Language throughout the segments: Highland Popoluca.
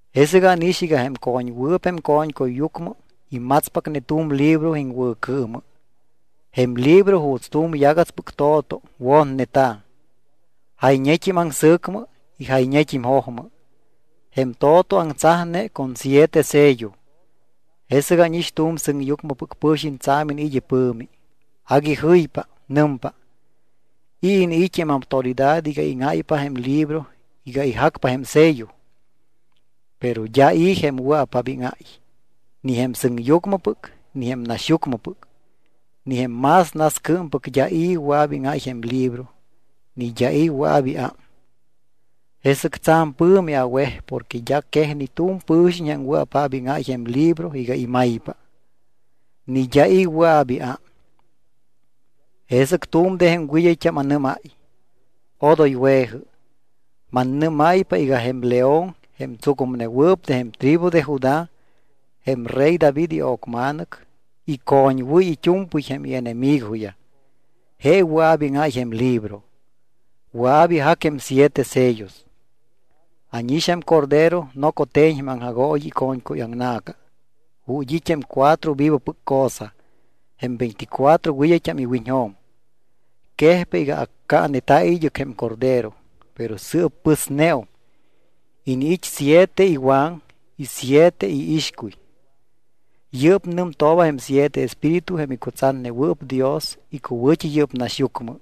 Jesɨc ánix iga jém co̱ñwɨɨp jém co̱ñcuyyucmɨ imatspacne tu̱m libro iŋwɨ̱cɨɨmɨ. Jém libro juuts tu̱m yagatspɨc to̱to wotneta̱. Jayñet́im aŋsɨ̱cmɨ y jayñet́im jojmɨ. Jém to̱to aŋtsajne con siete sello. Jesɨc ánix tu̱m sɨŋyucmɨpɨc pɨ̱xiñ tsa̱m iniit́ ipɨ̱mi. Agui jɨypa. Nɨmpa: —¿I̱ iniit́ jém autoridad iga íŋáypa jém libro iga ijacpa jém sello? Pero d́a i̱ jém wɨa̱paap íŋáy. Ni jém sɨŋyucmɨpɨc, ni jém naxyucmɨpɨc, ni jém más nascɨɨmpɨc d́a i̱ wɨa̱p íŋáy jém libro ni d́a i̱ wɨa̱p iám. Jesɨc tsa̱m pɨ̱mi awej porque d́a quej ni tu̱m pɨ̱xiñ jém wɨa̱paap íŋáy jém libro iga imaypa. Ni d́a i̱ wɨa̱p iám. Jesɨc tu̱m de jém wɨd́ayt́am anɨ́máy: —Odoy we̱jɨ. Mannɨ́máypa iga jém León jém tsucumnewɨɨp de jém tribu de Judá, jém rey David io̱cma̱nɨc, icoñwɨ́y it́u̱mpɨy jém ienemigoyaj. Je wɨa̱p íŋáy jém libro. Wɨa̱p ijac jém siete sellos. Ánix jém Cordero noco te̱ñ jém aŋjagooyi ico̱ñcuyaŋna̱ca ju̱t́ it́ jém cuatro vivopɨc cosa, jém veinticuatro wɨd́ayt́am iwiñjo̱m. Quejpa iga accaaneta̱ id́ɨc jém Cordero, pero sɨɨp pɨsneum. Iniit́ siete iwaŋ y siete iixcuy. Yɨ́p nɨmtooba jém siete espíritu jém icutsatnewɨɨp Dios icuwɨ̱t́i yɨ́p naxyucmɨ.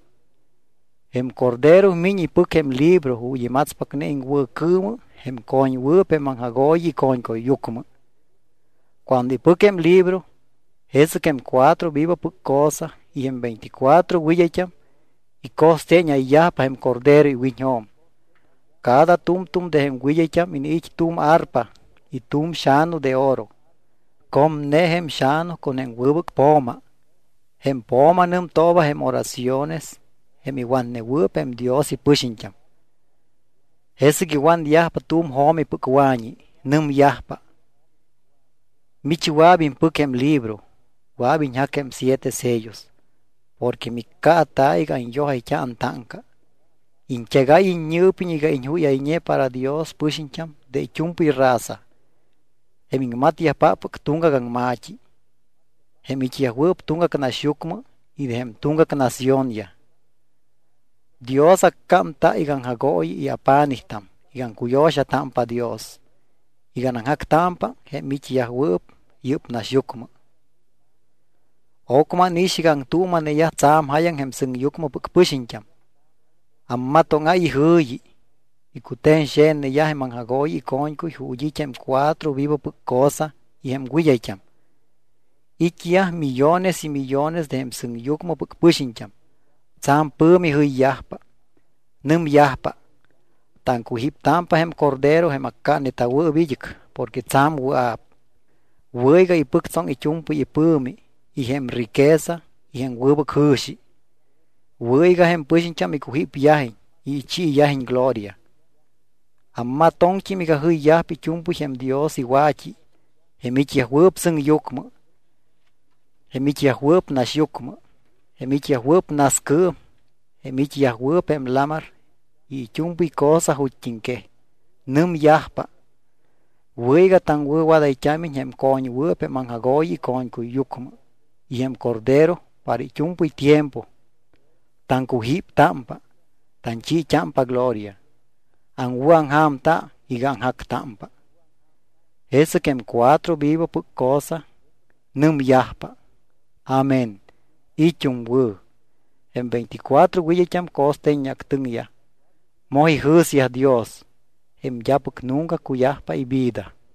Jém Cordero miñ ipɨc jém libro ju̱t́ imatspacne iŋwɨ̱cɨɨmɨ jém co̱ñwɨɨp jém aŋjagooyi ico̱ñcuyyucmɨ. Cuando ipɨc jém libro, jesɨc jém cuatro vivopɨc cosa y jém veinticuatro wɨd́ayt́am ico̱ste̱ñáypa jém Cordero iwiñjo̱m. Cada tu̱mtu̱m de jém wɨd́ayt́am iniit́ tu̱m arpa y tu̱m xa̱nu de oro. Comne jém xa̱nu con jém wɨbɨc po̱ma. Jém po̱ma nɨmtooba jém oraciones jém iwatnewɨɨp jém Dios ipɨxiñt́am. Jesɨc iwanyajpa tu̱m jo̱mipɨc wa̱ñi. Nɨmyajpa: Mich wɨa̱p impɨc jém libro. Wɨa̱p iñjac jém siete sellos. Porque miccaata̱ iga anyojayt́a antáŋca. Iñt́egáy iññɨɨpiñ iga iñjúyayñe para Dios pɨxiñt́am de it́u̱mpɨy raza, jém iŋmatyajpáppɨc tuŋgac aŋma̱t́i, jém it́yajwɨɨp tuŋgac naxyucmɨ y de jém tuŋgac naciónyaj. Dios accámta iga aŋjagooyi y apa̱nijt́am iga aŋcuyo̱xatámpa Dios iga anaŋjactámpa jém it́yajwɨɨp yɨ́p naxyucmɨ. Ocmɨ ánix iga aŋtuuma̱neyaj tsa̱m jáyaŋ jém sɨŋyucmɨpɨc pɨxiñt́am. Ammatóŋáy ijɨ̱yi. Icute̱ñxe̱tneyaj jém aŋjagooyi ico̱ñcuy ju̱t́ it́ jém cuatro vivopɨc cosa y jém wɨd́ayt́am. It́yaj millones y millones de jém sɨŋyucmɨpɨc pɨxiñt́am. Tsa̱m pɨ̱mi jɨyyajpa. Nɨmyajpa: Taŋcujíptámpa jém Cordero jém accaaneta̱wɨɨp id́ɨc porque tsa̱m wɨa̱p. Wɨ̱ iga ipɨctsoŋ it́u̱mpɨy ipɨ̱mi y jém riqueza y jém wɨbɨc jɨ̱xi. Wɨ̱ iga jém pɨxiñt́am icujípyajiñ y ichiiyajiñ gloria. Ammatoŋt́im iga jɨyyajpa it́u̱mpɨy jém Dios iwa̱t́i, jém it́yajwɨɨp sɨŋyucmɨ, jém it́yajwɨɨp naxyucmɨ, jém it́yajwɨɨp nascɨɨm, jém it́yajwɨɨp jém lamar y it́u̱mpɨy cosa ju̱t́iŋquej. Nɨmyajpa: Wɨ̱ iga taŋwɨ̱wadayt́ámiñ jém co̱ñwɨɨp jém aŋjagooyi ico̱ñcuyyucmɨ y jém Cordero para it́u̱mpɨy tiempo. Taŋcujíptámpa, tanchiit́ámpa gloria, aŋwɨ̱aŋja̱mta iga aŋjactámpa. Jesɨc jém cuatro vivopɨc cosa nɨmyajpa: —Amén. It́um wɨ̱. Jém veinticuatro wɨd́ayt́am co̱steeñactɨŋyaj. Moj ijɨ̱syaj Dios, jém d́apɨc nunca cuyajpa ivida.